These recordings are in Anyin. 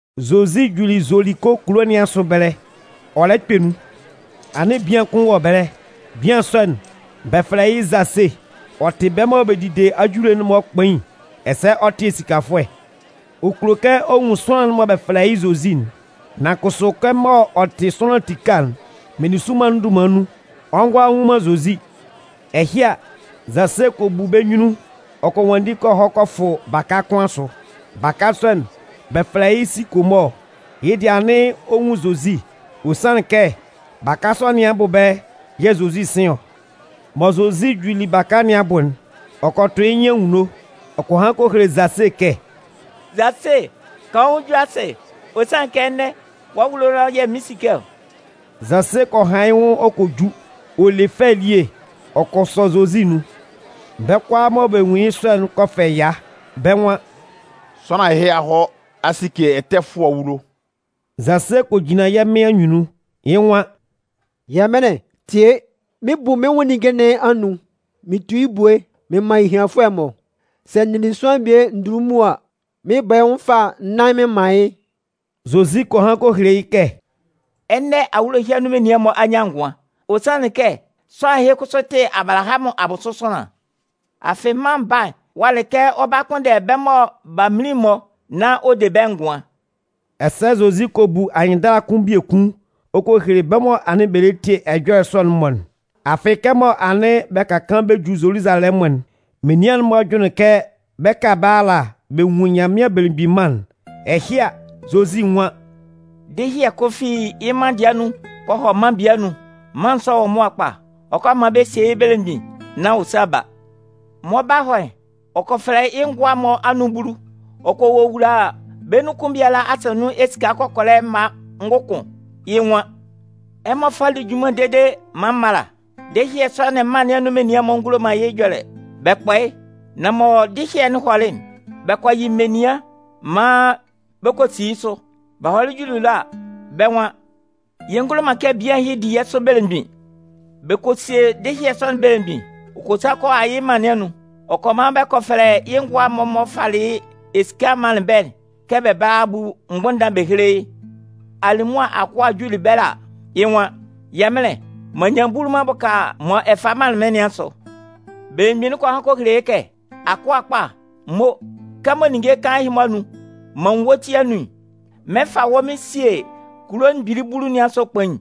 Zozi juli Zoliko kulo nɩn asʋ ɛbɛlɛ, ɔ lɛ kpɛ nun. Anɩn bian kʋn wɔ ɛbɛlɛ. Bian sɔ'n, bɛ fɛlɛ yɩ́ Zase. Ɔ tɩ bɛ́ mɔ bɛ dide ajule'n-mɔ kpain ɛsɛ ɔ tɩ esikafʋɛ. Ɔ kulo kɛ ɔ nwun sʋanlan'n mɔ bɛ fɛlɛ yɩ́ Zozi'n. Nan kʋsʋ kɛmɔ ɔ tɩ sʋanlan tika'n, meninsʋnman'n dunman nun, ɔ ngʋala nnwun man Zozi. Ɛhɩ a, Zase kɔ bu bɛ́ nyunnun ɔ kɔ nwanndi ɔ kɔ hɔ kɔ fʋ baka kʋn asʋ. Baka sɔ'n, bɛ fɛlɛ yɩ́ sikomɔɔ. Yɩ́ dɩɛ anɩn ɔ nwun Zozi. Ɔ sanlɩn kɛ baka sɔ nɩn abʋ ɛbɛlɛ yɛ̂ Zozi 'sɩn ɔ. Mɔ Zozi juli baka nɩn abʋ'n, ɔ kɔ tʋ yɩ́ nyɩn anwunno ɔ kɔ han kɔ hele Zase kɛ: “Zase, kan wɔ́ nwʋn ju asɩ. Ɔ sanlɩn kɛ ɛnɛ, wɔ́ awulo ɛlɔ yɛ̂ mɩn 'sike ɔ.” Zase kɔ han yɩ́ nwʋn ɔ kɔ ju ɔ le fɛ elie ɔ kɔ sɔ Zozi nun. Bɛ́ kʋalaa mɔ bɛ nwunlin yɩ́ sɔ'n kɔ fɛ ɛya. Bɛ́ nwan: “Sʋanlan ɛhɩ a hɔ a sike ɛtɛfʋɛ awulo!” Zase kɔ jinlan yɛ́ Mɩn anyunnun, yɩ́ nwan: “Yɛmɩnlɩn, tie! Mɩn 'bu mɩ́n nwʋn ninnge nɩn anun mɩn tu yɩ́ ebue mɩn man ehianfʋɛ'n-mɔ. Sɛ n nili sʋanlan bie ndunlunmun an, mɩn 'bɔ yɩ́ nwʋn fâ nnan mɩn man yɩ́.” Zozi kɔ han kɔ hele yɩ́ kɛ: “Ɛnɛ, awulo ɛhɩ anun menian'n-mɔ a nyan ngʋan. Ɔ sanlɩn kɛ sʋanlan ɛhɩ kʋsʋ tɩ Abalahamʋn abʋsʋ sʋanlan. Afɩ Mân Baa'n walɩ kɛ ɔ 'ba kpʋnndɛ bɛ́ mɔ b'a minlin'n-mɔ nán ɔ de bɛ́ ngʋan.” Ɛsɛ Zozi kɔ bu anyɩnndala kʋn biekun ɔ kɔ hele bɛ́ mɔ anɩn bɛ lɛ tie ɛjɔlɛ sɔ'n-mɔ'n. Afɩ, kɛmɔ anɩn bɛ ka kaan bɛ ju Zoluzalɛmʋn'n, menian'n-mɔ jʋnlɩn kɛ bɛ 'ka ɛbɛlɛ ala bɛ nwun Nyanmɩan Belemgbin Mân'n. Ɛhɩ a, Zozi nwan: “Dɩhyɩɛ kʋn fi yɩ́ mân dɩɛ anun kɔ hɔ mân bie anun. Mân sɔ'n wɔ mʋa kpa. Ɔ 'kɔ maan bɛ sie yɩ́ belemgbin nán ɔ sa ba. Mɔ ɔ 'ba hɔ'n, ɔ kɔ fɛfɛlɛ yɩ́ ngʋa'n-mɔ anun bulu. Ɔ kɔ wowula bɛ́ nun kʋn biala asa nun esika kɔkɔlɛ mma ngʋkʋn. Yɩ́ nwan: ‘Ɛmɔ fá lí junman dede maan m mála.’ “Dɩhyɩɛ sɔ'n mân nɩn anun menian'n-mɔ ngulo man yɩ́ ɛjɔlɛ, bɛ kpɔ yɩ́. Nan mɔ dɩhyɩɛ'n hɔlɩ'n, bɛ kɔ yɩ menian maan bɛ kɔ si yɩ́ sʋ. Bɛ hɔlɩ juli ɛlɔ a, bɛ́ nwan: ‘Yɛ ngulo man kɛ bian ɛhɩ di yɛ́ sʋ belemgbin.’ “Bɛ kɔ sie dɩhyɩɛ sɔ'n belemgbin, ɔ kɔ sa kɔ a yɩ́ mân nɩn anun. Ɔ kɔ man bɛ kɔ fɛfɛlɛ yɩ́ ngʋa'n-mɔ m'ɔ falɩ esika'n manlɩn bɛ́'n kɛ bɛ bála a bu mgbʋnndan bɛ héle yɩ́. “Alimʋa akʋa'n juli ɛbɛlɛ a, yɩ́ nwan: ‘Yɛmɩnlɩn, m'an nyan bulu m'an bʋka mɔ ɛ falɩ manlɩn mɩ́n nɩn asʋ.’ “Belemgbin'n kɔ han kɔ hele yɩ́ kɛ: ‘Akʋa kpa, mo! Kɛmɔ ninnge kaan ɛhɩ-mɔ anun m'an nwun wɔ́ ti anun'n, mɩn 'fa wɔ́ mɩn sie kulo mgbili bulu asʋ kpain.’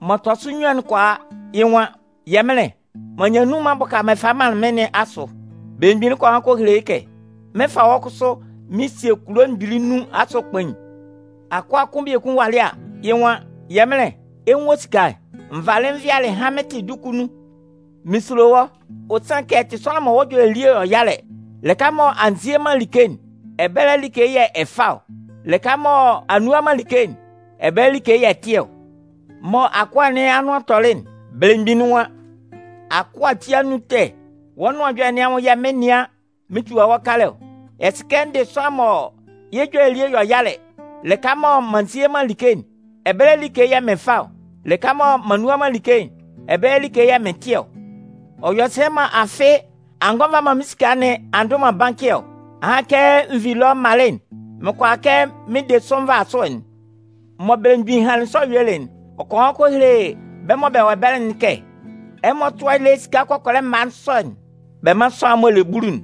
“M'ɔ tɔ sʋ nnyuan'n kɔ a. Yɩ́ nwan: ‘Yɛmɩnlɩn, m'an nyan nnun m'an bʋka mɔ ɛ falɩ manlɩn mɩ́n nɩn asʋ.’ “Belemgbin kɔ han kɔ hele yɩ́ kɛ: ‘Mɩn 'fa wɔ́ kʋsʋ mɩn sie kulo mgbili nnun asʋ kpain.’ “Akʋa kʋn biekun walɩ a, yɩ́ nwan: ‘Yɛmɩnlɩn, ɛ 'nwun wɔ́ esika'n. N valɩ n vɩalɩ hanmɩntɩ duku nun. Mɩn sulo wɔ́, ɔ sanlɩn kɛ ɛ tɩ sʋanlan mɔ wɔ́ ɛjɔlɛ elie yɔ yalɛ. Lɩka mɔ a nzie man like'n, ɛbɛlɛ like yɛ̂ ɛ fa ɔ. Lɩka mɔ a nnu a man like'n, ɛbɛlɛ like yɛ̂ ɛ tɩ ɔ.’ “Mɔ akʋa nɩn anʋan tɔlɩ'n, belemgbin'n nwan: ‘Akʋa ati anun ɛtɛ, wɔ́ nʋan ɛjɔlɛ nɩn anwʋn yɛ̂ mɩn 'nɩan mɩn tua wɔ́ kalɛ ɔ. Ɛ sɩ kɛ n dɩ sʋanlan mɔ yɩ́ ɛjɔlɛ elie yɔ yalɛ, lɩka mɔ m'an nzie man like'n, ɛbɛlɛ like yɛ̂ mɩn fa ɔ. Lɩka mɔ m'an nnu a man like'n, ɛbɛlɛ like yɛ̂ mɩn tɩ ɔ. Ɔ yɔ sɛ mɔ afɩ a ngɔ a nva man mɩ́n esika nɩn a ndʋ man bankɩ ɔ? Ahan kɛ n vi ɛlɔ m malɩ'n, mɩn kʋala kɛ mɩn de sʋ nvasʋɛ'n.’ “Mɔ belemgbin hanlɩn sɔ yuelɩ'n, ɔ kɔ han kɔ hele bɛ́ mɔ bɛ wɔ ɛbɛlɛ'n kɛ: ‘Ɛmɔ tʋ́a yɩ́ lé esika kɔkɔlɛ mma sɔ'n bɛ mán sʋanlan'n m'ɔ le bulu'n.’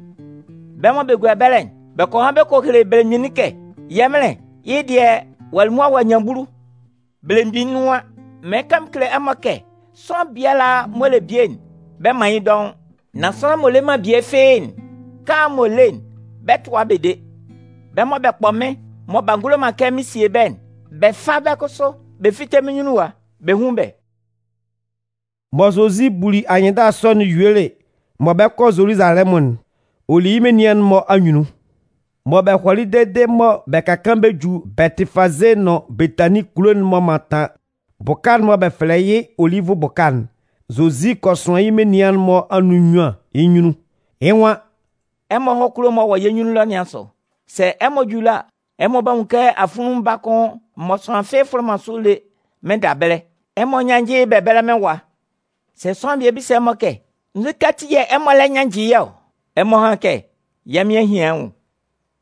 “Bɛ́ mɔ bɛ gua ɛbɛlɛ'n, bɛ kɔ han kɔ hele belemgbin'n kɛ: ‘Yɛmɩnlɩn, yɩ́ dɩɛ, ɔ'a li mʋa ɔ'a nyan bulu!’ “Belemgbin nwan: ‘Mɩɩn kan mɩn kele ɛmɔ kɛ sʋanlan m'ɔ le bie'n, bɛ 'man yɩ́ dɔʋn. Nan sʋanlan m'ɔ le man bie fɩ́ɩ́'n, kaan'n m'ɔ le'n, bɛ 'tʋa yɩ́ bɛ de. Bɛ́ mɔ bɛ kpɔ mɩ́n mɔ b'a ngulo man kɛ mɩn sie bɛ́'n, bɛ fá bɛ́ kʋsʋ bɛ fíte mɩ́n nyunnun ɛwa bɛ hún bɛ́.’” Mɔ Zozi buli anyɩnndala sɔ'n yuelɩ mɔ bɛ 'kɔ Zoluzalɛmʋn'n, ɔ li yɩ́ menian'n-mɔ anyunnun. Mɔ bɛ hɔlɩ dede mɔ bɛ ka kaan bɛ ju Bɛtɩfaze nʋn Betanin kulo'n m'ɔ mantan bʋka'n mɔ bɛ fɛlɛ yɩ́ Olivʋ bʋka'n, Zozi kɔ sʋan yɩ́ menian'n-mɔ anun nnyuan yɩ́ nyunnun. Yɩ́ nwan: “Ɛmɔ hɔ́ kulo'n m'ɔ wɔ yɛ́ nyunnun ɛlɔ nɩn asʋ. Sɛ ɛmɔ ju ɛlɔ a, ɛmɔ 'ba nwun kɛ afunlunmun baa kʋn mɔ sʋanlan fɩ́ɩ́ fʋlɩ man sʋ lé mɩnnda ɛbɛlɛ. Ɛmɔ nyánnjɩ yɩ́ bɛ bɛ́lɛ mɩ́n ɛwa. Sɛ sʋanlan bisa ɛmɔ kɛ: ‘Nzukɛ ati yɛ̂ ɛmɔ lɛ nyannjɩ yɩ́ ɔ?’ Ɛmɔ hán kɛ: ‘Yɛ́ Mɩn a hian yɩ́ nwʋn.’”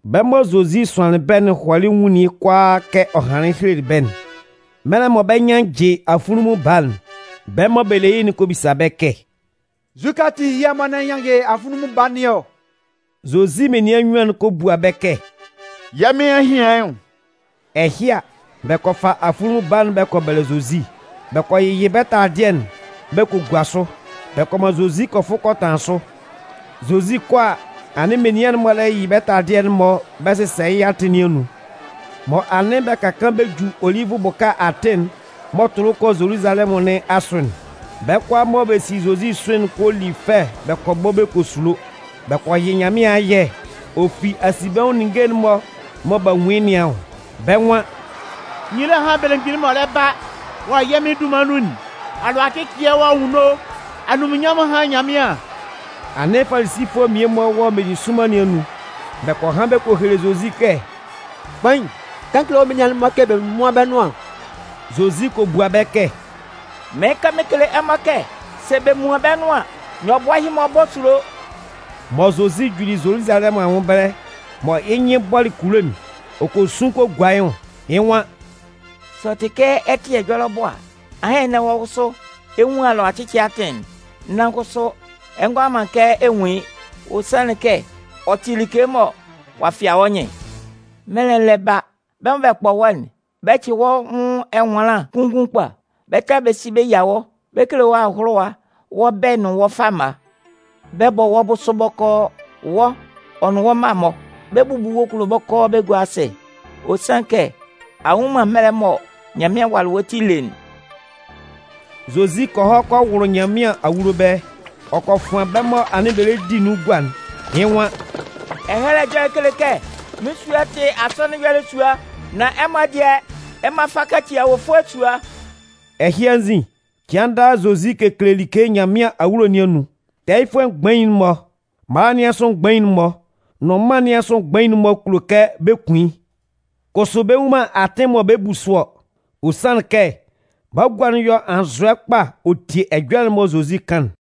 Bɛ́ mɔ Zozi sʋanlɩn bɛ́'n hɔlɩ nwunlin yɩ́ kʋalaa kɛ ɔ hanlɩn helelɩ bɛ́'n. Mɛlɛ mɔ bɛ 'nyannjɩ afunlunmun baa'n, bɛ́ mɔ bɛ le yɩ́'n kɔ bisa bɛ́ kɛ: ‘Nzukɛ ati yɛ̂ ɛmɔ lɛ nyannjɩ afunlunmun baa nɩn ɔ?’ Zozi menian nnyuan'n kɔ bua bɛ́ kɛ: ‘Yɛ́ Mɩn a hian yɩ́ nwʋn.’ Ɛhɩ a, bɛ kɔ fa afunlunmun baa'n bɛ kɔ bɛlɛ Zozi. Bɛ kɔ yɩyɩ bɛ́ taladɩɛ'n bɛ kɔ gua sʋ. Bɛ kɔ man Zozi kɔ fʋ kɔ tanlan sʋ. Zozi 'kɔ a, anɩn menian'n-mɔ lɛ yɩyɩ bɛ́ taladɩɛ'n-mɔ bɛ sɩsɛ yɩ́ atɩn nɩn anun. Mɔ anɩn bɛ ka kaan bɛ ju Olivʋ bʋka atɩn'n m'ɔ tʋlʋ kɔ Zoluzalɛmʋn nɩn asʋ'n, bɛ́ kʋalaa mɔ bɛ si Zozi sʋ'n kɔ li fɛ bɛ kɔ bɔ bɛ kɔ sulo. Bɛ kɔ yɩ Nyanmɩan ayɛ ɔ fi asinbɛnwʋn ninnge'n-mɔ mɔ b'a nwun yɩ́ nɩn anwʋn. Bɛ́ nwan: “Nyila hán belemgbin'n m'ɔ lɛ ba wɔ yɛ́ Mɩn dunman nun'n! Alʋacɩcɩɛ wɔ anwunno, anunminnyanmʋn hán Nyanmɩan!” Anɩn Falisifʋɛ mmie-mɔ wɔ meninsʋnman nɩn anun. Bɛ kɔ han bɛ kɔ hele Zozi kɛ: “Kpain, kan kele wɔ́ menian'n-mɔ kɛ bɛ múan bɛ́ nʋan.” Zozi kɔ bua bɛ́ kɛ: “Mɩɩn kan mɩn kele ɛmɔ kɛ sɛ bɛ muan bɛ́ nʋan an, nyɔbʋɛ'n-mɔ 'bɔ sulo!” Mɔ Zozi juli Zoluzalɛmʋn anwʋn ɛbɛlɛ mɔ yɩ́ nyɩn bɔlɩ kulo'n, ɔ kɔ sun kɔ gua yɩ́ nwʋn. Yɩ́ nwan: “Sɛ ɔ tɩ kɛ ɛ tɩ ɛjɔlɛ abʋ a, ahan ɛnɛ wɔ́ kʋsʋ, ɛ 'nwun alʋacɩcɩɛ atɩn'n! Nan kʋsʋ, ɛ ngʋala man kɛ ɛ nwun yɩ́. Ɔ sanlɩn kɛ ɔ tɩ like mɔ ɔ'a fɩa wɔ́ nyɩn. Mɛlɛ'n lɛ ba, bɛ́ mɔ bɛ kpɔ wɔ́'n, bɛ 'cɩ wɔ́ nwʋn ɛnwanlan kunngun kpa. Bɛ 'ta bɛ si bɛ yia wɔ́. Bɛ 'kele wɔ́ ahʋlʋwa wɔ́ bɛ̂ nʋn wɔ́ fama. Bɛ 'bɔ wɔ́ bʋsʋ bɔkɔɔ, wɔ́, ɔ nʋn wɔ́ mma'n-mɔ. Bɛ 'bubu kulo'n bɔkɔɔ bɛ gua yɩ́ asɩ. Ɔ sanlɩn kɛ a nnwun man mɛlɛ'n mɔ Nyanmɩan walɩ wɔ́ ti ele'n!” Zozi kɔ hɔ kɔ wʋlʋ Nyanmɩan awulo ɛbɛlɛ, ɔ kɔ fʋan bɛ́ mɔ anɩn bɛ lɛ di nun gua'n. Yɩ́ nwan: “Ɛhɛlɛ Ɛjɔlɛ'n kele kɛ: Mɩ́n sua'n tɩ asɔnɩn ɛyɔlɛ sua. Nan ɛmɔ dɩɛ, ɛmɔ a fa a kaci awofʋɛ sua.” Ɛhɩ anzin, cɩan daa, Zozi kekele like Nyanmɩan awulo nɩn anun. Tɛɛyɩfʋɛ mgbain'n-mɔ, mala nɩn asʋ mgbain'n-mɔ nʋn mân nɩn asʋ mgbain'n-mɔ kulo kɛ bɛ kun yɩ́. Kʋsʋ bɛ nnwun man atɩn mɔ bɛ 'bu sʋ ɔ. Ɔ sanlɩn kɛ bagua'n yɔ anzʋɛ kpa ɔ tie ɛjɔlɛ'n mɔ Zozi kan'n.